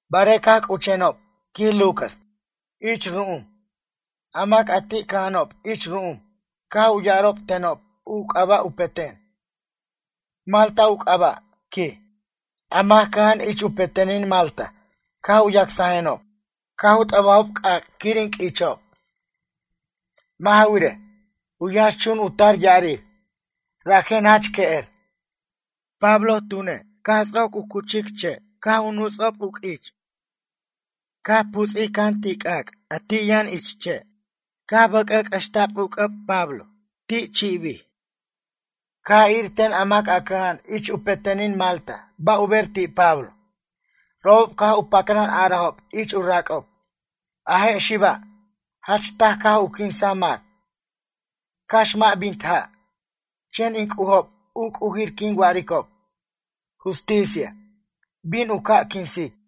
Barej caj c'uchenob, quij Lucas, ich ru'um, a mac ti' cʌja'anob ich ru'um caj u ya'arob tenob u c'aba' u peten. Malta u c'aba', quij. A mac cʌja'an ich u petenin Malta caj u yacsajenob. Caj u t'ʌbajob c'ac' quir in q'uichob. Mʌ' ja wirej, u yʌnx chun u tar ya'arir, rajen jach que'er. Pablo tune', caj ts'oc u cuchic si', caj u nuts'ob q'uich. Caj puts'ij can ti' c'ac', a ti' yʌn ich si' ca' bʌc'ʌc'ʌxta'b u c'ʌb Pablo, ti' chi'bir. Caj ir ten a mac a cʌja'an ich u petenin Malta ba' u ber ti' Pablo. Robob caj u pacran a'arajob ich u rac'ob: ―A je' xiba', jach taj caj u quinsaj mac, cax mʌ' bint ja' chen in c'ujob u c'ujir quin wa'aricob, Justicia, bin u ca' u quinsic.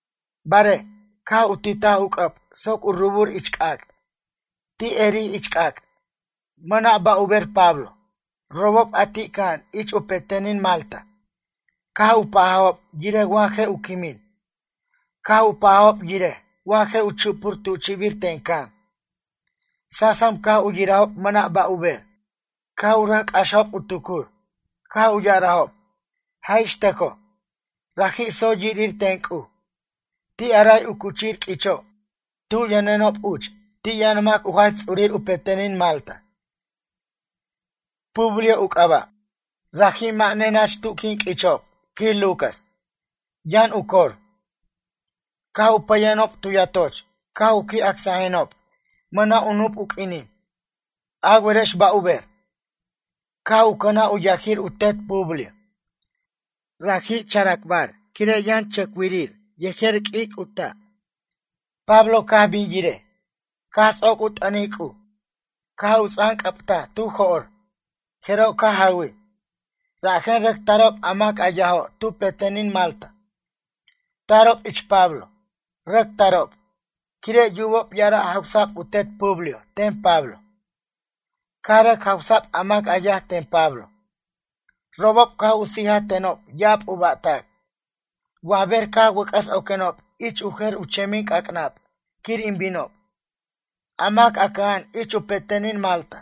Barej, caj u titaj u c'ʌb soc u rubur ich c'ac'. Ti' erij ich c'ac'. Mʌna' ba' u ber Pablo. Robob a ti' cʌja'an ich u petenin Malta, caj u pajajob yirej wa je' u quimin. Caj u pajajob yirej wa je' u chupur tu chi'bir ten can. Sasam caj u yirajob mʌna' ba' u ber, caj u rʌc c'axajob u tucur, caj u ya'arajob: ―Jaj ix tʌcoj, raji' tsoy yirir ten c'uj. Ti' a ray u cuchir q'uicho' tu yʌnenob uch ti' yʌn mac u jach ts'urir u petenin Malta. Publio u c'aba'. Raji' mʌ' nenach tu quin q'uichob, quij Lucas, yʌn u cor. Caj u pʌyenob tu yatoch caj u qui' acsajenob mʌna' u nup u q'uinin. A werex ba' u ber? Caj u cʌnaj u yajir u tet Publio. Raji' characbar, quire' yʌn chʌcwirir yejer q'uic' u ta'. Pablo caj bin yirej, caj ts'oc u t'ʌnic C'uj caj u ts'anc'ʌbtaj tu jo'r, jeroj caj jawij. Rajen rʌc tarob a mac yajo' tu petenin Malta, tarob ich Pablo. Rʌc tarob, quire' yubob ya'ara' jawsa'b u tet Publio ten Pablo. Caj rʌc jawsa'b a mac yaj ten Pablo. Robob caj u sijaj tenob ya'ab u ba'tac. Wa ber caj wʌc'ʌs oquenob ich u jer u chemin c'ac'nab quir in binob, a mac a cʌja'an ich u petenin Malta,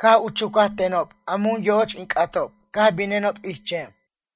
caj u chucaj tenob a mun yo'och in c'atob caj binenob ich chem.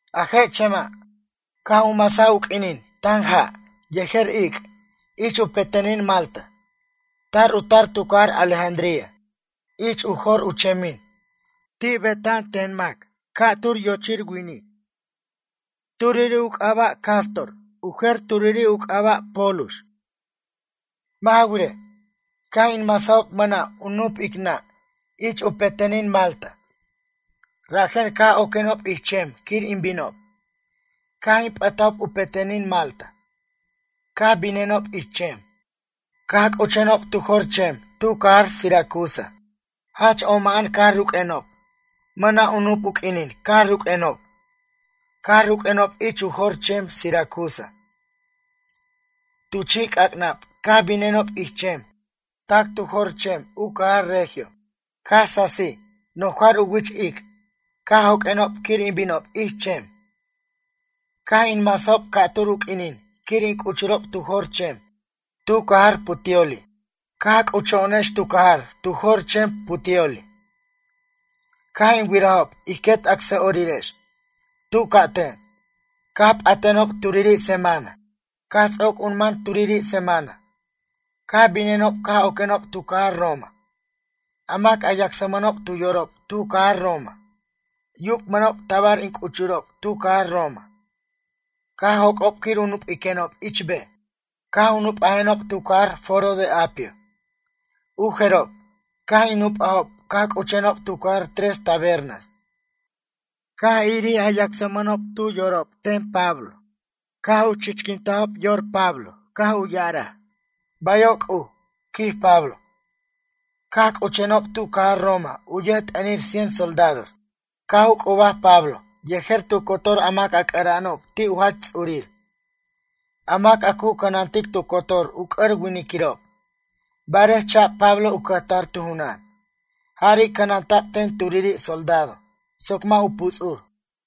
A je' chema', caj u masaj u q'uinin tan ja' yejer ic' ich u petenin Malta. Tar u tar tu cajar Alejandría. Ich u jor u chemin, ti' beta'an ten mac ca'tur yochir winic. Turiri' u c'aba' Cástor, u jer turiri' u c'aba' Pólux. Mʌ' ja wirej, caj in masajob mʌna' u nup ic nʌ' ich u petenin Malta, rajen caj oquenob ich chem quir in binob. Caj in p'ʌtajob u petenin Malta, caj binenob ich chem. Caj c'uchenob tu jor chem tu cajar Siracusa. Jach oma'an caj ruq'uenob, mʌna' u nup u q'uinin caj ruq'uenob. Caj ruq'uenob ich u jor chem Siracusa. Tu chi' c'ac'nab caj binenob ich chem tac tu jor chem u cajar Regio. Caj sasij nojar u wich ic' caj joq'uenob quir in binob ich chem. Caj in masajob ca'tur u q'uinin quir in c'uchurob tu jor chem tu cajar Puteoli. Caj c'ucho'onex tu cajar tu jor chem Puteoli, caj in wirajob ij quet acsa'orirex. Tu c'aten, caj p'atenob turiri semana. Caj ts'oc u man turiri' semana, caj binenob caj oquenob tu cajar Roma. A mac a yacsmʌnob tu yorob tu cajar Roma, yubmʌnob tabar in c'uchurob tu cajar Roma, caj joc'ob quir u nup'iquenob ich bej. Caj u nup'ajenob tu cajar Foro de Apio. U jerob, caj in nup'ajob caj c'uchenob tu cajar Tres Tabernas. Caj irir a yacsmʌnob tu yorob ten Pablo, caj u chichquintajob yor Pablo caj u ya'araj: “Bayo' C'uj”, quij Pablo. Caj c'uchenob tu cajar Roma u yʌjt'ʌnir cien soldados caj u c'ubaj Pablo yejer tu cotor a mac c'ʌra'anob ti' u jach ts'urir, a mac a cu cʌnantic tu cotor u c'ʌr winiquirob. Barej cha'b Pablo u cʌjtar tu junan. Jari' cʌnanta'b ten turiri' soldado soc mʌ' u puts'ur.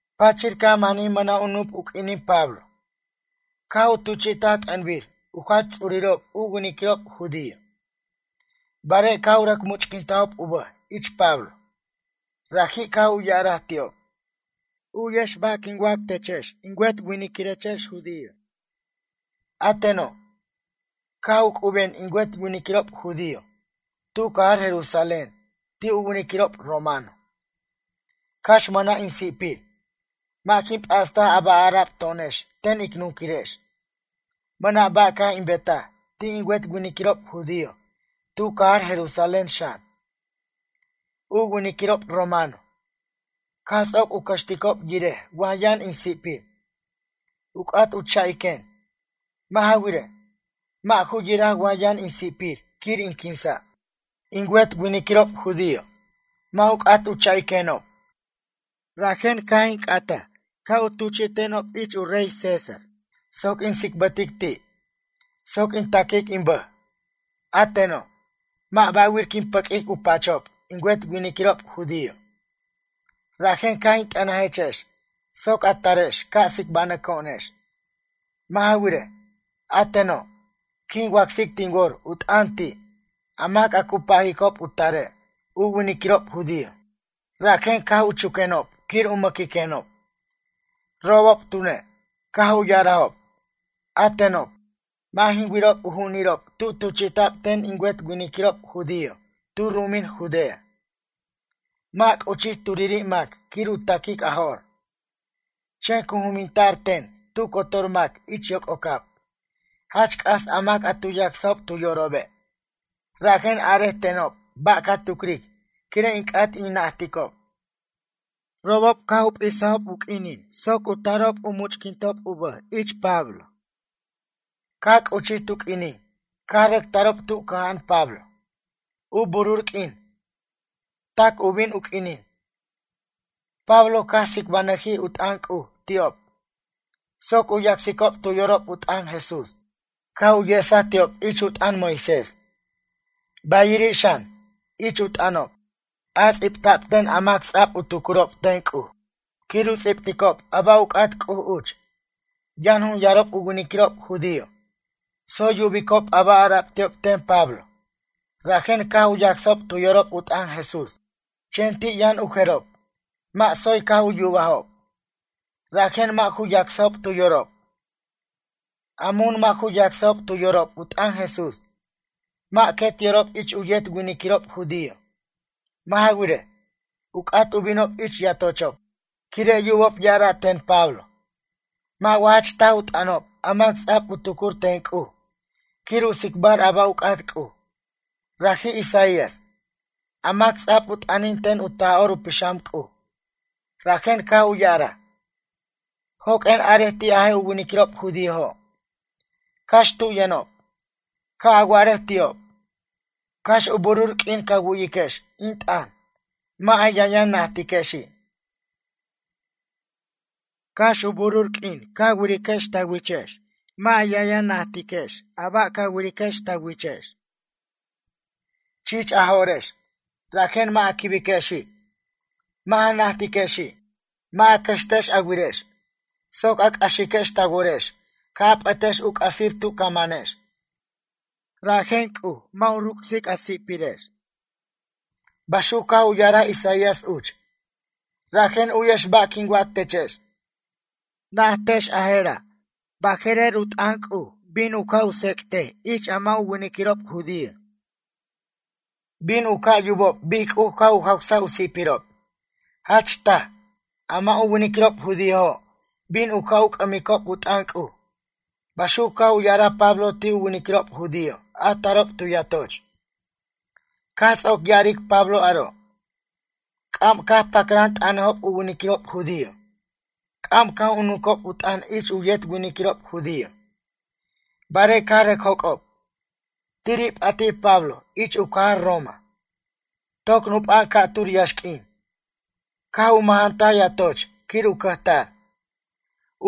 Pachir caj manij mʌna' u nup u q'uinin Pablo, caj u tuchi'taj t'ʌnbir u jach ts'urirob u winiquirob judío. Barej, caj u rʌc much'quintajob u bʌj ich Pablo, raji' caj u ya'araj ti'ob: ―U'yex ba' quin wac techex in wet winiquirechex judío. A teno', caj u c'uben in wet winiquirob judío tu cajar Jerusalén ti' u winiquirob romano, cax mʌna' in si'pir. Mʌ' jin p'astaj a ba' ara'b to'onex ten ic nunquirex, mʌna' ba' caj in betaj ti' in wet winiquirob judío tu cajar Jerusalén xan. U winiquirob romano, caj ts'oc u cʌxticob yirej wa yʌn in si'pir, u c'at u cha'iquen. Mʌ' ja wirej, mʌ' ju yiraj wa yʌn in si'pir quir in quinsa'. In wet winiquirob judío, mʌ' u c'at u cha'iquenob. Rajen caj in c'ataj, ca' u tuchi'tenob ich u rey César soc in tsicbʌtic ti' soc in taquic in bʌj. A teno', mʌ' ba'wir quin pʌq'uic u pachob in wet winiquirob judío. Rajen caj in t'ʌnajechex soc a tarex ca' tsicbanʌco'onex. Mʌ' ja wirej, a teno', quin wacsic tin wor u t'ʌn ti' a mac a cu pajicob u tarej u winiquirob judío, rajen caj u chuquenob quir u mʌquiquenob. Robob tune', caj u ya'arajob: ―A tenob, mʌ' jin wirob u ju'unirob tu tuchi'ta'b ten in wet winiquirob judío tu ru'umin Judea. Mʌ' c'uchij turiri' mac quir u ta'quic a jo'r. Chen cu juminta'r ten tu cotor mac ich yoc'ocab, jach c'as a mac a tu yacsob tu yorobe'. Rajen arej tenob ba' ca tucric quire' in c'at in najticob. Robob caj u p'isajob u q'uinin soc u tarob u much'quintob u bʌj ich Pablo. Caj c'uchij tu q'uinin caj rʌc tarob tu cʌja'an Pablo. U burur q'uin, tac u bin u q'uinin, Pablo caj tsicbanʌjij u t'ʌn C'uj ti'ob soc u yacsicob tu yorob u t'ʌn Jesús, caj u yesaj ti'ob ich u t'ʌn Moisés, bayiri' xan, ich u t'ʌnob, a ts'ibta'b ten a mac ts'a'b u tucurob ten C'uj, quir u ts'ibticob a ba' u c'at C'uj uch. Yʌn jun yarob u winiquirob judío, tsoy yubicob a ba' ara'b ti'ob ten Pablo rajen caj u yacsajob tu yorob u t'ʌn Jesús, chen ti' yʌn u jerob, mʌ' tsoy caj yubajob, rajen mʌ' ju yacsajob tu yorob. A mun mʌ' ju yacsajob tu yorob u t'ʌn Jesús, mʌ' quet yorob ich u yet winiquirob judío, mʌ' ja wirej, u c'at u binob ich yatochob, quire' yubob ya'ara' ten Pablo: ―Mʌ' wa jach taj u t'ʌnob a mac ts'a'b u tucur ten C'uj quir u tsicbar a ba' u c'at C'uj? Raji' Isaías, a mac ts'a'b u t'ʌnin ten u Taj'or u Pixam C'uj, rajen caj u ya'araj: Joq'uen arej ti' a je' u winiquirob judíojo', cax tu yʌnob. Ca' a wa'arej ti'ob: Cax u burur q'uin ca wu'yiquex in t'ʌn mʌ' a yʌnyʌn najtiquexi'. Cax u burur q'uin ca wiriquex ta wichex mʌ' a yʌnyʌn najtechex a ba' ca wiriquex ta wichex. Chich a jo'rex, rajen mʌ' a quibiquexi', mʌ' ja najtiquexi'. Mʌ' a cʌxtex a wirex soc a c'axiquex ta worex ca' a p'ʌtex u c'asir tu ca manex. Rajen C'uj, mʌ' u ruc's a si'pirex. Baxuc caj u ya'araj Isaías uch. Rajen u'yex ba' quin wac techex. Naj techex a jera', baje'rer, u t'ʌn C'uj bin u ca' u tsec'tej ich a mʌ' u winiquirob judío. Bin u ca' u yubob bic C'uj caj u jawsaj u si'pirob. Jach taj, a mʌ' u winiquirob judíojo' bin u ca' u c'ʌmicob u t'ʌn C'uj. Baxuc caj u ya'araj Pablo ti' u winiquirob judío a tarob tu yatoch. Caj ts'oc ya'aric Pablo aro'. C'am caj pacran t'ʌnajob u winiquirob judío, c'am caj u nunquob u t'ʌn ich u yet winiquirob judío, barej caj rʌc joc'ob. Tiri' p'atij Pablo ich u cajar Roma, toc nupa'an ca'tur yaxq'uin. Caj u mʌjantaj yatoch quir u cʌjtar,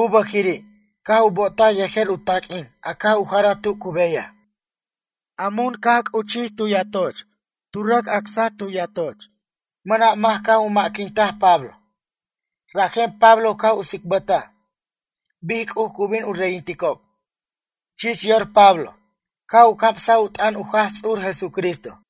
u bʌjiri' caj u bo'otaj yejer u taq'uin a caj u jaraj tu cu beyaj. A mun caj u c'uchur tu yatoch cu rʌc acsaj tu yatoch. Mʌna' mac caj u ma'quintaj Pablo, rajen Pablo caj u tsicbʌtaj bic C'uj cu bin u reyinticob. Chich yor Pablo caj u camsaj u t'ʌn u Jaj Ts'ur Jesucristo.